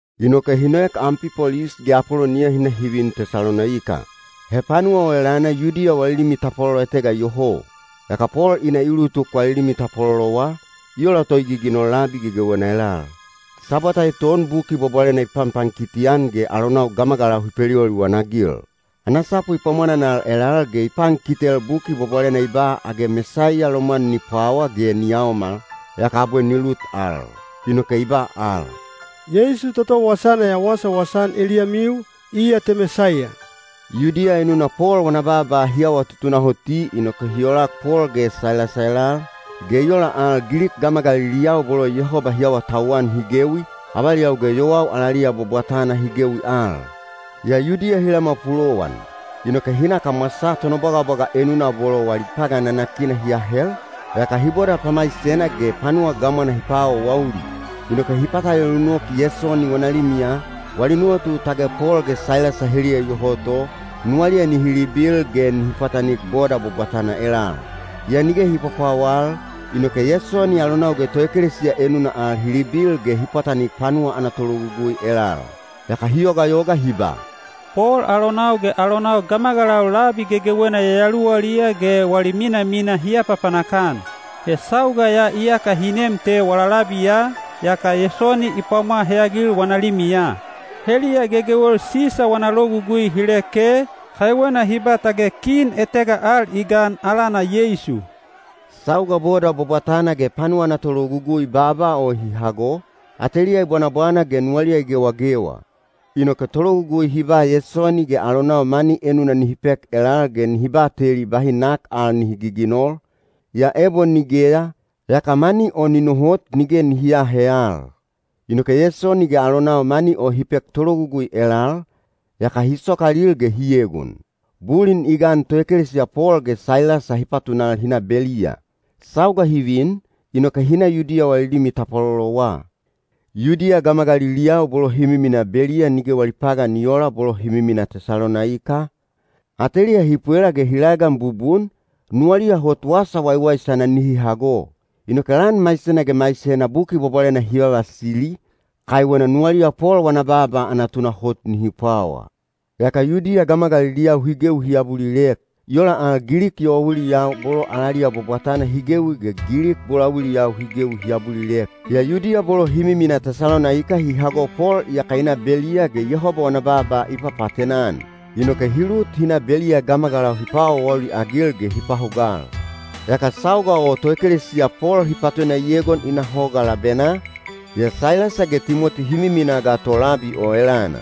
Inoke hi noek Ampipolis ge Apoloniya hi na hi vin Tesalonaika. He panuwa o elana Yudiya wali limi tapwalolo etega iyoho. Yaka Pol i na i ulutuk wali limi tapwalolowa, i ola to i giginol labi gegewena elal. Sabwata eton Buki Bwabwalena i panpankiti-an ge alonau gamagalau hi peliwaliwan-agil. Ana sapu i pwamwananal elal ge i pankitel Buki Bwabwalena i ba age Mesaiya lomwan ni pwawa ge ni yaomal, yaka abwe ni lut al. Inoke i ba al, “Yeisu toto wasana ya wasawasa-an eliyamiu, iya te Mesaiya.” Yudiya enuna Pol wana baaba hi awa tutunahoti inoke hi olak Pol ge Sailasa elal, ge i ola al Gilik gamagaliliyau bolo Yehoba hi awatauwan hi gewi, avaliyau ge yowau alaliya bwabwatana hi gewi al. Yaa Yudiya hi lamwa pulowan. Inoke hi na kamwasaa tonobwagabwaga enuna bolo wali pagan nanakina hi ahel, yaka hi boda pamaisena ge panuwa gamwana hi paawaawauli. Inoke hi patalelu nok Yesoni wana limiya, wali nuwatu tage Pol ge Sailasa heliya iyoho to, nuwaliya nihi libil ge nihi pwatanik boda bwabwatana elal. Yaa nige hi pwapwawal, inoke Yesoni alonau ge toekelesiya enuna al hi libil ge hi pwatanik panuwa ana tologugui elal. Yaka hi yogayoga hi ba, “Pol alonau ge alonau gamagalau labi gegewena yayaluwaliya ge wali minamina hi apapanak-an. He sauga ya iyaka hi nem te wala labiya, yaka Yesoni i pwamwa heyagil wana limiya. Heliya gegewel Sisa wana logugui hi leke, kaiwena hi ba tage kin etega al i gan alana Yeisu.” Sauga boda bwabwatana ge panuwa ana tologugui baaba o hi hago, ateliya i bwanabwana ge nuwaliya i gewagewa. Inoke tologugui hi ba Yesoni ge alonau mani enuna nihi pek elal ge nihi bateli bahi nak al nihi giginol, yaa ebo nigeya, yaka mani o ni nohot nige nihi aahe al. Inoke Yesoni ge alonau mani o hi pek tologugui elal, yaka hi sokalil ge hi egon. Bulin i gan toekelesiya Pol ge Sailasa hi patunal hi na Beliya. Sauga hi vin, inoke hi na Yudiya wali limi tapwalolowa. Yudiya gamagaliliyau bolo hi miminaa Beliya nige wali pagan i oola bolo hi miminaa Tesalonaika, ateliya hi pwela ge hi laegan bubun, nuwaliya hot wasa waiwaisana nihi hago. Inoke lan maisena ge maisena Buki Bwabwalena hi vavasili, kaiwena nuwaliya Pol wana baaba ana tunahot nihi pwawa. Yaka Yudiya gamagaliliyau hi gewi hi abulilek. I ola al Gilik yowauiliyau bolo alaliya bwabwatana hi gewi ge Gilik bolauiliyau hi gewi hi abulilek. Yaa Yudiya bolo hi miminaa Tesalonaika hi hago Pol iyaka i na Beliya ge Yehoba wana baaba i papaatena-an. Inoke hi lut hi na Beliya gamagalau hi paawaawauli-agil ge hi pahugal. Yaka sauga o toekelesiya Pol hi patuna i egon i na hoga labenaa, yaa Sailasa ge Timoti hi miminaa ga to labi o elana.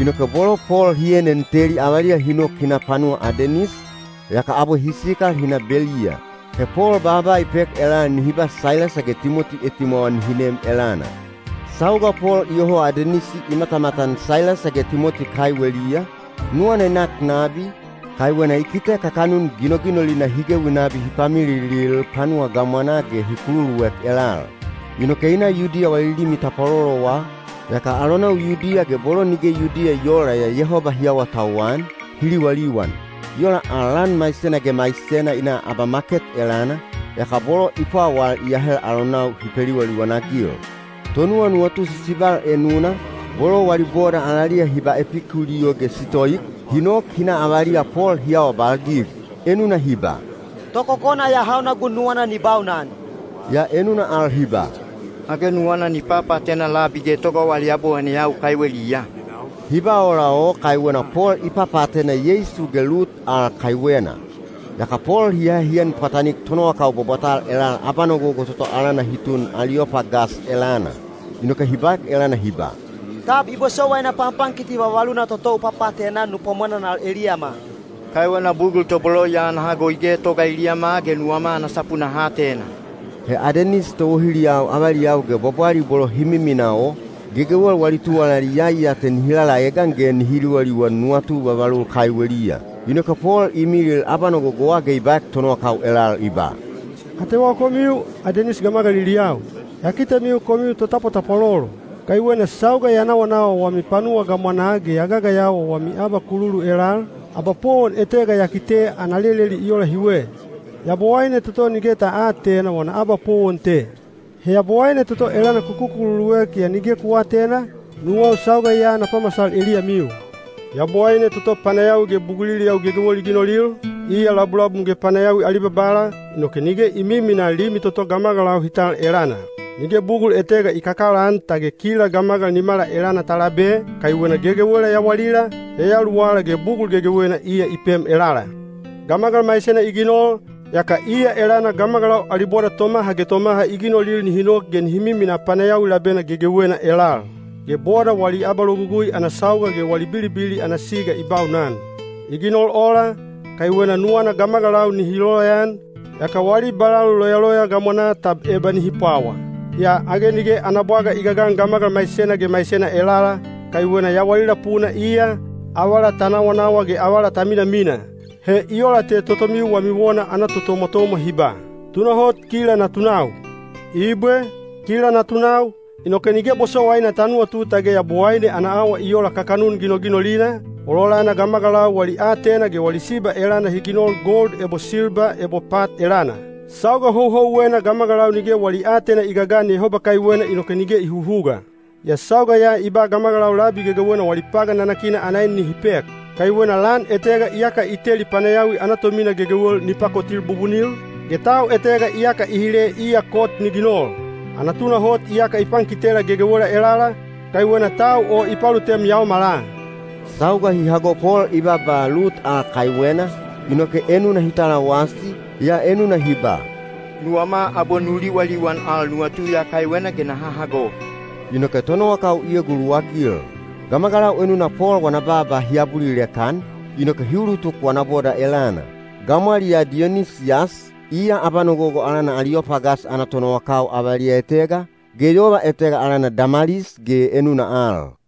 Inoke bolo Pol hi enen teli avaliya hi nok hi na panuwa Adenis, yaka abwe hi sikal hi na Beliya. He Pol baaba i pek elal nihi ba Sailasa ge Timoti etimwawa nihi nem elana. Sauga Pol iyoho Adenis i matamatan Sailasa ge Timoti kaiweliya, nuwana i nak nabi, kaiwena i kite kakanun ginoginolina hi gewi nabi hi pamililil panuwa gamwanaa ge hi kululuek elal. Inoke i na Yudiya wali limi tapwalolowa, yaka alonau Yudiya ge bolo nige Yudiya i oola yaa Yehoba hi awatauwan, hi liwaliwan. I ola al lan maisena ge maisena i na abamaket elana, yaka bolo i pwawal i ahel alonau hi peliwaliwan-agil. Tonuwanuwatu sisibal enuna, bolo wali boda alaliya hi ba Epikuliyo ge Sitoik, hi nok hi na avaliya Pol hi awabalgig. Enuna hi ba, “Tokokona ya hauna gun nuwana ni baunan?” Yaa enuna al hi ba, “Age nuwana ni papaatena labi getoga wali yabowaineyau kaiweliya?” Hi ba ola o kaiwena Pol i papaatena Yeisu ge lut al kaiwena. Yaka Pol hi ahe hi en pwatanik tonowakau bwabwatal elal abanogogo toto alana hi tun Aliyopagas elana. Inoke hi baek elana hi ba, “Tab i bosowaina panpankiti vavaluna toto u papaatena-an nu pwamwananal eliyama? Kaiwena bugul tobolo ya ana hago i getoga eliyama ge nuwama ana sapu naha atena.” (He Adenis towohiliyau avaliyau ge bwabwali bolo hi miminaa o, gegewel wali tuwalali iyai ya te nihi lalaegan ge nihi liwaliwan nuwatu vavalul kaiweliya.) Inoke Pol i milil abanogogowa ge i baek tonowakau elal i ba, “Atewau komiu, Adenis gamagaliliyau. Ya kitemiu komiu totapwatapwalolo. Kaiwena sauga ya nawanawa wami panuwa gamwanaa ge ya gagayawa wami abakululu elal, abapowon etega ya kite ana leleli i ola hiwe: ‘Yabowaine toto nige ta aatena wana abapowon te.’ He Yabowaine toto elana ku kukululuek yaa nige ku aatena, nuwau sauga ya na pamasal eliyamiu. “Yabowaine toto panayawi ge buguliliyau gegewel i ginolil, iya labulabum ge panayawi ali Babala, inoke nige i miminaa limi toto gamagalau hi tal elana. Nige bugul etega i kakalaan tage kila gamagal nimala elana ta labe, kaiwena gegewela yawalila, yayaluwala ge bugul gegewena iya i pem elala. Gamagal maisena i ginol, yaka iya elana gamagalau ali boda tomaha ge tomaha i ginolil nihi nok ge nihi miminaa panayawi labena gegewena elal. Ge boda wali abalogugui ana sauga ge wali bilibili ana siga i baunan. I ginol ola, kaiwena nuwana gamagalau nihi loyaan, yaka wali balalu loyaloya gamwanaa tab eba nihi pwawa. Yaa age nige ana bwaga i gagan gamagal maisena ge maisena elala, kaiwena ‘yawalila puna iya, avala ta nawanawa ge avala ta minamina.’ He i ola te totomiu wami wona ana totomwatomwa hi ba, ‘Tunahot kila natunau.’ “Ibwe, kila natunau, inoke nige bosowaina ta nuwatu tage Yabowaine ana awa i ola kakanun ginoginolina, ololana gamagalau wali aatena ge wali siba elana hi ginol gold ebo silba ebo pat elana. Sauga houhouwena gamagalau nige wali aatena i gagan Yehoba kaiwena inoke nige i huhuga. Yaa sauga ya i ba gamagalau labi gegewena wali pagan nanakina ana en nihi pek. Kaiwena lan etega iyaka i teli panayawi ana tomina gegewel ni pakotil bubunil, ge tau etega iyaka i hile iya kot ni ginol. Ana tunahot iyaka i pankitela gegewela elala, kaiwena tau o i palutem yaomala.” Sauga hi hago Pol i baaba lut al kaiwena, inoke enuna hi talawasi, yaa enuna hi ba, “Nuwama abwe nu liwaliwan al nuwatu ya kaiwena ge naha hago.” Inoke tonowakau i eguluwagil. Gamagalau enuna Pol wana baaba hi abulilek-an, inoke hi ulutuk wana boda elana. Gamwaliyaa Diyonisiyas, iya abanogogo alana Aliyopagas ana tonowakau avaliya etega, ge yova etega alana Damalis ge enuna al.